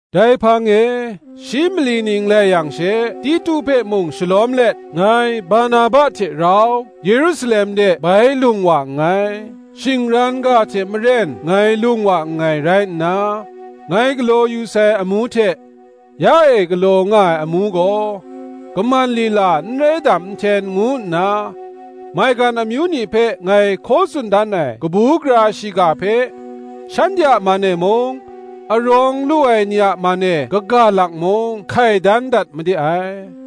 Dai hpang e shi mali ning lai yang she, Titu hpe mung shalawm let, ngai Barnaba hte rau Yerusalem de bai lung wa nngai. Shingran ga hte maren ngai lung wa nngai rai nna, ngai galaw yu sai amu hte, ya e galaw nga ai amu gaw, kaman lila n rai dam nhten ngu nna, maigan amyu ni hpe ngai hkaw tsun dan ai kabu gara shiga hpe, shanhte a man e mung, arawng lu ai ni a man e kaga lak mung, hkai dan dat made ai.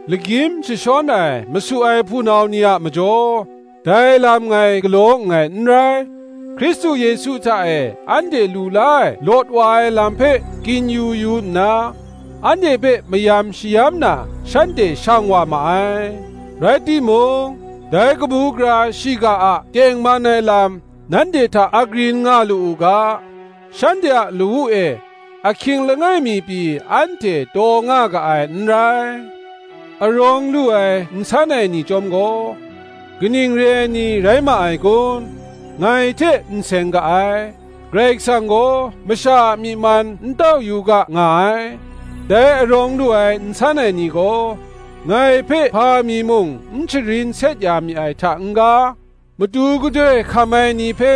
Lagyim jashawn ai masu ai hpunau ni a majaw, dai lam ngai galaw nngai n rai; Hkristu Yesu hta e anhte lu la ai lawt wa ai lam hpe kin-yu yu nna, anhte hpe mayam shayam na shanhte shang wa ma ai; rai timung, dai kabu gara shiga a tengman ai lam nanhte hta agrin nga lu u ga, shanhte a lawu e ahkying langai mi pyi anhte taw nga ga ai n rai. Arawng lu ai nsan ai ni chyawm gaw, kaning re ai ni rai ma ai kun, ngai hte n seng ga ai; Karai Kasang gaw masha a myi man n tau yu ga nga ai: dai arawng lu ai nsan ai ni gaw, ngai hpe hpa mi mung n sharin set ya mi ai hta n-ga, matu gadoi hkam ai ni hpe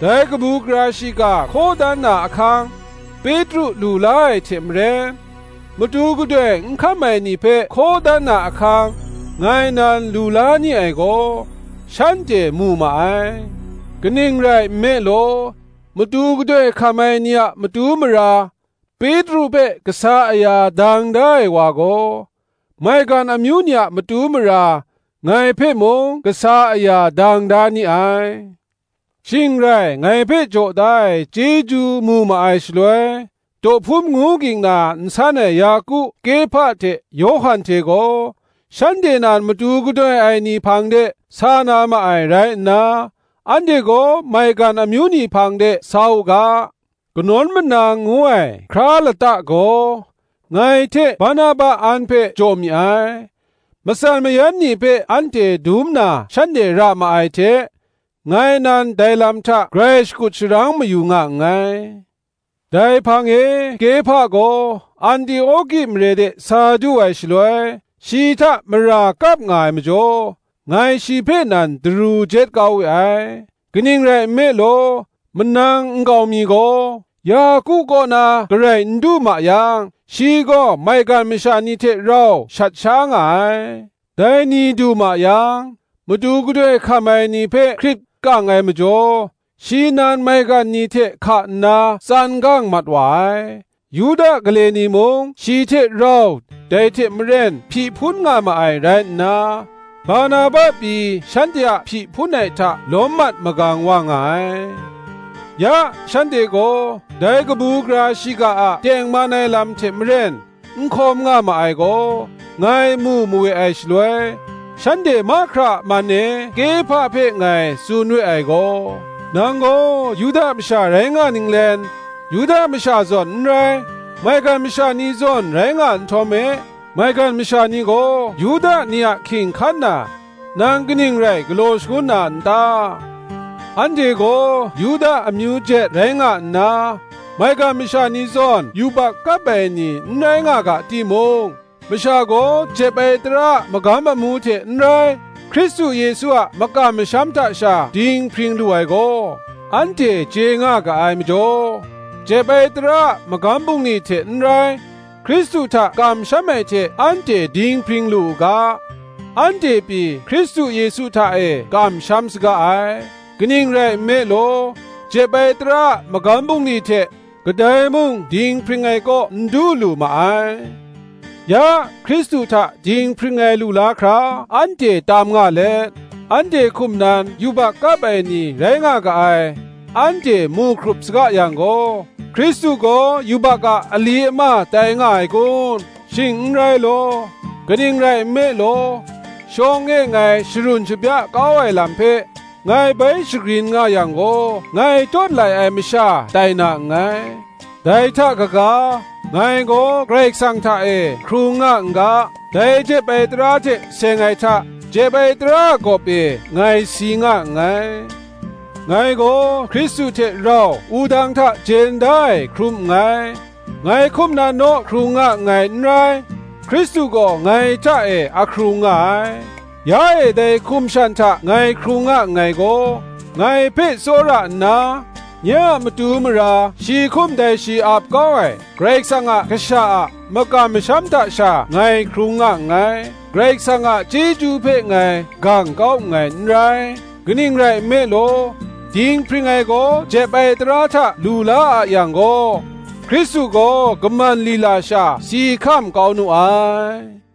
dai kabu gara shiga hkaw dan na ahkang, Petru lu la ai hte maren, matu gadoi n hkam ai ni hpe hkaw dan na ahkang, ngai nan lu la ni ai gaw, shanhte mu ma ai. Kaning rai nme law, matu gadoi hkam ai ni a matu mara Petru hpe kasa aya dang da ai wa gaw, maigan amyu ni a matu mara ngai hpe mung kasa aya dang da ni ai. Shing rai ngai hpe jaw da ai chyeju mu ma ai shaloi, dawhpum ngu ging na nsan ai Yaku, Kehpa hte Yawhan hte gaw, shanhte nan matu gadoi ai ni hpang de sa na ma ai rai nna, anhte gaw maigan amyu ni hpang de sa u ga, kanawn manang ngu ai hkra lata gaw ngai hte Barnaba an hpe jaw mi ai. Matsan mayan ni hpe anhte dum na shanhte ra ma ai hte, ngai nan dai lam hta grai shakut sharang mayu nga nngai. Dai hpang e Kepha gaw Antioki mare de sa du ai shaloi, shi hta mara kap nga ai majaw, ngai shi hpe nan daru jet kau we ai. Kaning rai nme law, manang nkau mi gaw Yaku kaw na garai n du ma yang, shi gaw maigan masha ni hte rau shat sha nga ai; dai ni du ma yang, matu gadoi hkam ai ni hpe hkrit kang ai majaw, shi nan maigan ni hte hka nna tsan gang mat wa ai. Yuda gale ni mung shi hte rau dai hte maren hpyi hpun nga ma ai rai nna, Barnaba pyi shanhte a hpyi hpun ai hta lawm mat magang wa nga ai. Ya shanhte gaw dai kabu gara shiga a tengman ai lam hte maren n hkawm nga ma ai gaw, ngai mu mawe ai shaloi, shanhte mahkra a man e Kehpa hpe ngai tsun we ai gaw, “Nang gaw Yuda masha rai nga ninglen, Yuda masha zawn n rai, maigan masha ni zawn rai nga nhtawm e, maigan masha ni gaw Yuda ni a hking hkan na, nang kaning rai galaw shangun na n ta? Anhte gaw Yuda amyu jet rai nga nna, maigan masha ni zawn yubak kap ai ni n rai nga ga timung, masha gaw jep ai tara a magam amu hte n rai, Hkristu Yesu a makam masham hta sha dinghpring lu ai gaw, anhte chye nga ga ai majaw, jep ai tara a magam bungli hte n rai, Hkristu hta kamsham ai hte anhte dinghpring lu u ga, anhte pyi Hkristu Yesu hta e kamsham saga ai: kaning rai nme law, jep ai tara a magam bungli hte kadai mung dinghpring ai kaw n du lu ma ai. Ya, Hkristu hta dinghpring ai lu la hkra anhte tam nga let, anhte hkum nan yubak kap ai ni rai nga ga ai, anhte mu hkrup saga yang gaw, Hkristu gaw yubak a ali ama tai nga ai kun? Shing n rai law. Kaning rai nme law, shawng e ngai sharun shabya kau ai lam hpe, ngai bai shagrin nga yang gaw, ngai tawt lai ai masha tai na nngai. Dai hta kaga, ngai gaw Karai Kasang hta e hkrung nga n ga, dai jep ai tara hte seng ai hta, jep ai tara a gawp e ngai si nga nngai. Ngai gaw Hkristu hte rau wudang hta jen da ai hkrum nngai. Ngai hkum nan naw hkrung nga nngai n rai, Hkristu gaw ngai hta e ahkrung nga ai: ya e dai hkum shan hta ngai hkrung nga nngai gaw, ngai hpe tsawra nna, nye a matu mara shi hkum dai shi ap kau ai Karai Kasang a Kasha a makam masham hta sha ngai hkrung nga nngai. Karai Kasang a chyeju hpe ngai gang kau nngai n rai: kaning rai nme law, dinghpring ai gaw jep ai tara hta lu la a yang gaw, Hkristu gaw kaman lila sha si hkam kau nu ai.”